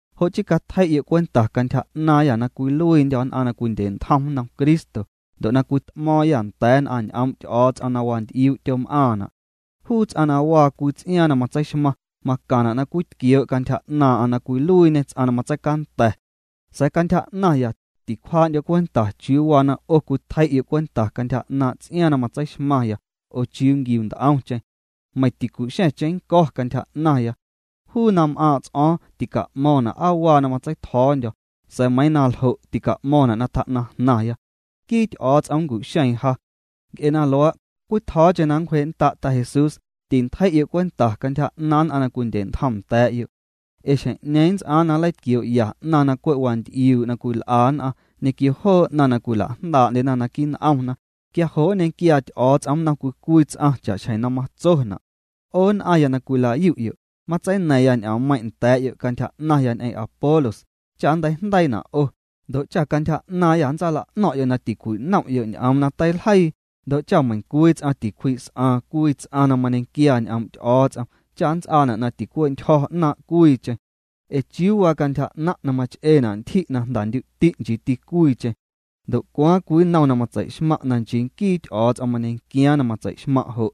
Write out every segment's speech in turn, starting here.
Jo' chii catjei'yo' cwenta cantyja 'naaⁿyâ na cwiluiindyô̱ nn'aⁿ na cwindye'ntjom nnom Cristo, ndo' na cwit'mo̱o̱ⁿyâ nda̱a̱ nn'aⁿ ñ'oom' Ty'o̱o̱ts'om na wanty'iuu' tyom'aⁿna'. Juu ts'aⁿ na waa cwii ts'iaaⁿ na matseixmaⁿ, macaⁿna' na cwitquioo' cantyja 'naaⁿ'aⁿ na cwiluiiñê ts'aⁿ na matseicanda̱. Sa̱a̱ cantyja 'naⁿya, ticwjaa'ndyo̱ cwenta chiuu waa na 'o cwitjei'yo' cwenta cantyja 'naaⁿ' ts'iaaⁿ na matseixmaⁿya oo chiuu nquiu nt'omcheⁿ. Meiⁿ ticu'xa̱ⁿ cheⁿnnco̱ cantyja 'naⁿya. Juu na m'aaⁿ' ts'o̱o̱ⁿ tica'mo̱ⁿna' aa waa na matseitjo̱o̱ndyo̱, sa̱a̱ meiiⁿ na ljo' tica'mo̱ⁿna' na tjaa jnaⁿya. Nquii Ty'o̱o̱ts'om nncu'xeeⁿ ja. Nc'e na luaa', cwitjo̱o̱cheⁿ na nncwjee'nnda' Ta Jesús, tintjei'yo' cwenta cantyja 'naaⁿ nn'aⁿ na cwindye'ntjom nda̱a̱'yo'. Ee xjeⁿ'ñeeⁿ nnts'aaⁿ na nleitquioo'ya 'naⁿ na cwe' wanty'iuu' cwil'a nn'aⁿ ñequio joo 'naⁿ na cwila'jndaa'ndyena naquii' n'omna. Quia jo' nñequiaa Ty'o̱o̱ts'om nnom cwii cwii ts'aⁿ cha'xjeⁿ na matsona'. 'O nn'aⁿya na cwila'yu'yo', matseina̱ⁿya ñ'oommeiⁿ' nda̱a̱'yo' cantyja 'naⁿya ñ'eⁿ Apolos cha nnteijndeiina' 'o, ndo' cha cantyja 'naaⁿyâ nntsaala'no̱ⁿ'yo' na tincwinom'yo' ñ'oom na teiljeii, ndo' cha meiⁿcwii ts'aⁿ tincwji's'aaⁿ cwii ts'aⁿ na mañequiaa ñ'oom' Ty'o̱o̱ts'om cha nnts'aana' na ticwentyjo̱ 'naaⁿ' cwiicheⁿ. Ee ¿chiuu waa cantyja 'naⁿ' na mach'eena' ntyji' na jndandyu'ti' nchiiti cwiicheⁿ? Ndo' ¿cwaaⁿ cwii nnom na matsei'xmaⁿ' na nchii nquii Ty'o̱o̱ts'om mañequiaaⁿ na matsei'xmaⁿ' jo'?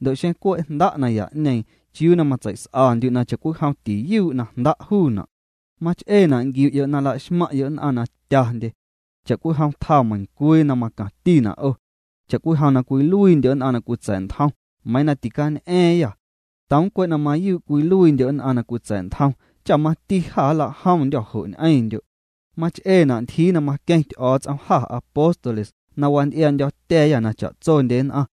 Ndo' xeⁿ cwe' jnda' naya'ñeeⁿ, ¿chiuu na matseis'andyu' na cha'cwijom tiyuu' na jnda' juuna'? Mach'eena' na nquiu'yo' na la'xmaⁿ'yo' nn'aⁿ na tyandye. Cha'cwijom tjaa meiⁿcwii na macaⁿtina' 'o. Cha'cwijom na cwiluiindyo' nn'aⁿ na cwitsa̱'ntjom, meiiⁿ na ticañ'a̱a̱ⁿyâ̱. Toom cwe' na mayuu' cwiluiindyo' nn'aⁿ na cwitsa̱'ntjom cha mati jâ nla'jomndyô̱ jo' ñ'eⁿndyo'. Mach'eena' ntyjii na maqueⁿ Ty'o̱o̱ts'om jâ apóstoles na wanty'iaa'ndyo̱tya̱a̱yâ na cha'tsondye nn'aⁿ.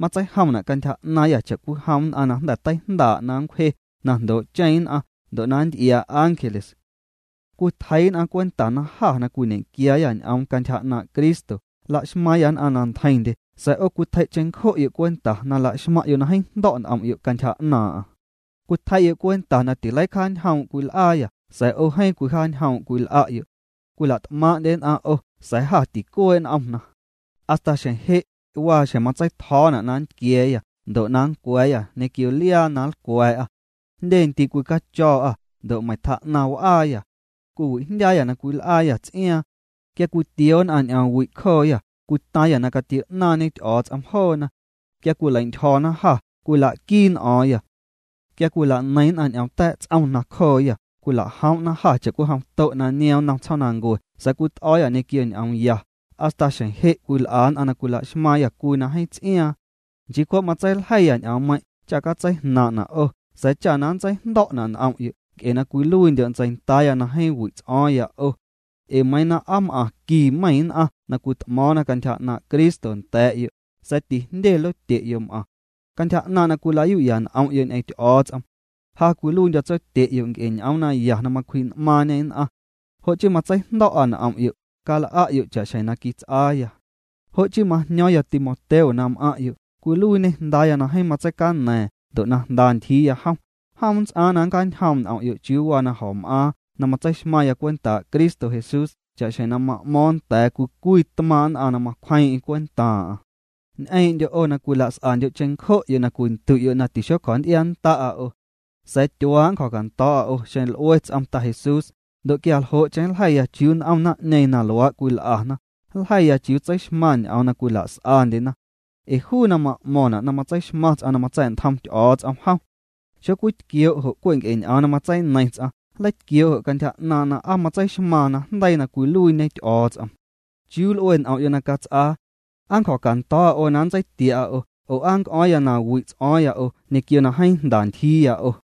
Matseijomna' cantyja 'naaⁿyâ cha'cwijom nn'aⁿ na jnda̱ teijndaa' na nncwje na jndoo'cheⁿ nn'aⁿ ndo' nnty'iaa ángeles. Cwitjeii' nn'aⁿ cwenta na jâ na cwiñequiaayâ ñ'oom cantyja 'naaⁿ' Cristo la'xmaaⁿyâ nn'aⁿ na ntjeiⁿndye sa̱a̱ 'o cwitjei' cheⁿncjo'yo' cwenta na la'xmaⁿ'yo' na jeeⁿ jndo̱' n'om'yo' cantyja 'naaⁿ'aⁿ. Cwitjei'yo' cwenta na tileicjaanjoom' cwil'aayâ sa̱a̱ 'o jeeⁿ cwijaanjoom' cwil'a'yo'. Cwila't'maaⁿ'ndye nn'aⁿ 'o sa̱a̱ jâ ticuee' n'omna. Hasta xjeⁿ je', waa xjeⁿ na matseitjo̱o̱na' na nntquia̱a̱yâ ndo' na nncwa̱a̱yâ ñequio liaa na nlcwa̱a̱'â. Jndye ndii' cwicacho̱o̱'â, ndo' meiⁿ tjaa'naⁿ w'aaya. Cwiwijndyaayâ na cwil'aayâ ts'iaaⁿ. Quia cwitioo nn'aⁿ ñ'oomwi' cjooyâ, cwitaaⁿyâ na catio'naaⁿñe Ty'o̱o̱ts'om joona. Quia cwileintyjo̱na jâ, cwila'quii n'o̱o̱ⁿyâ. Quia cwila'neiⁿ nn'aⁿ ñ'om ta̱a̱' ts'om nacjooyâ, cwila'joom'na jâ cha'cwijom to' na niom nnom tsjoomnancue sa̱a̱ cwit'o̱o̱yâ ñequio ñ'oom ya. Hasta xjeⁿ je' cwil'a nn'aⁿ na cwila'xmaaⁿyâ cwii na jeeⁿ ts'iaaⁿ. Nchii cwe' matseiljeiya ñ'oommeiⁿ' cha catseijnaaⁿ'na 'o sa̱a̱ cha na nntseijndo̱'na' n'om'yo' nc'e na cwiluiindyo' ntseindaaya na jeeⁿ wi' ts'o̱o̱ⁿya 'o. Ee meiiⁿ na aa m'aⁿ qui meiⁿ nn'aⁿ na cwit'mo̱o̱ⁿna cantyja 'naaⁿ' Cristo nda̱a̱'yo', sa̱a̱ tijndye lotye'yo' m'aⁿ. Cantyja 'naaⁿ' na cwila'yu'ya n'om'yo' ñ'eⁿ Ty'o̱o̱ts'om, ja cwiluiindyo̱ tsotye'yo' nc'e ñ'oom naya na macwji'n'maaⁿñê nn'aⁿ. Jo' chii matseijndo̱'a n'om'yo', cal'a'yo' cha'xjeⁿ na quits'aaya. Jo' chii majño̱o̱ⁿya Timoteo na m'aⁿ'yo', cwiluiiñê jndaaya na jeeⁿ matseicaña̱a̱ⁿ ndo' na jnda ntyjiiya jom, jom nnts'aaⁿ na nncjaañjoom' n'om'yo' chiuu waa na jo̱m'aaⁿ na matseixmaⁿya cwentaa' Cristo Jesús cha'xjeⁿ na ma'mo̱o̱ⁿ nda̱a̱ nn'aⁿ cwii cwii tmaaⁿ' nn'aⁿ na macwjeeⁿ'eⁿ cwentaaⁿ'aⁿ. Ñ'eeⁿndyo' 'o na cwilas'andyo' cheⁿncjo'yo' na cwindu'yo' na tixocjo̱nty'iannda'a 'o. Sa̱a̱ tyuaa' nncjo̱cando̱o̱'a 'o xeⁿ l'ue ts'om Ta Jesús, ndo' quia ljo'cheⁿ nljeiya chiuu n'om naⁿ'ñeeⁿ na luaa' cwil'ana, nljeiya chiuu tseixmaⁿ ñ'oom na cwila's'andyena. Ee juu na ma'mo̱ⁿna' na matseixmaⁿ ts'aⁿ na matsa̱'ntjom Ty'o̱o̱ts'om jom, xocwitquioo' jo' cwe' nc'e ñ'oom na matseineiⁿ ts'aⁿ, nleitquioo' jo' cantyja 'naaⁿ' na aa matseixmaaⁿ najndeii na cwiluiiñe Ty'o̱o̱ts'om. ¿Chiuu nl'ue n'om'yo' na cats'aa? ¿Aa nncjo̱cando̱o̱'a 'o na nntseitia'a 'o, oo aa nnc'o̱o̱ⁿya na wi' ts'o̱o̱ⁿya 'o, ñequio na jeeⁿ jnda ntyjiiya 'o?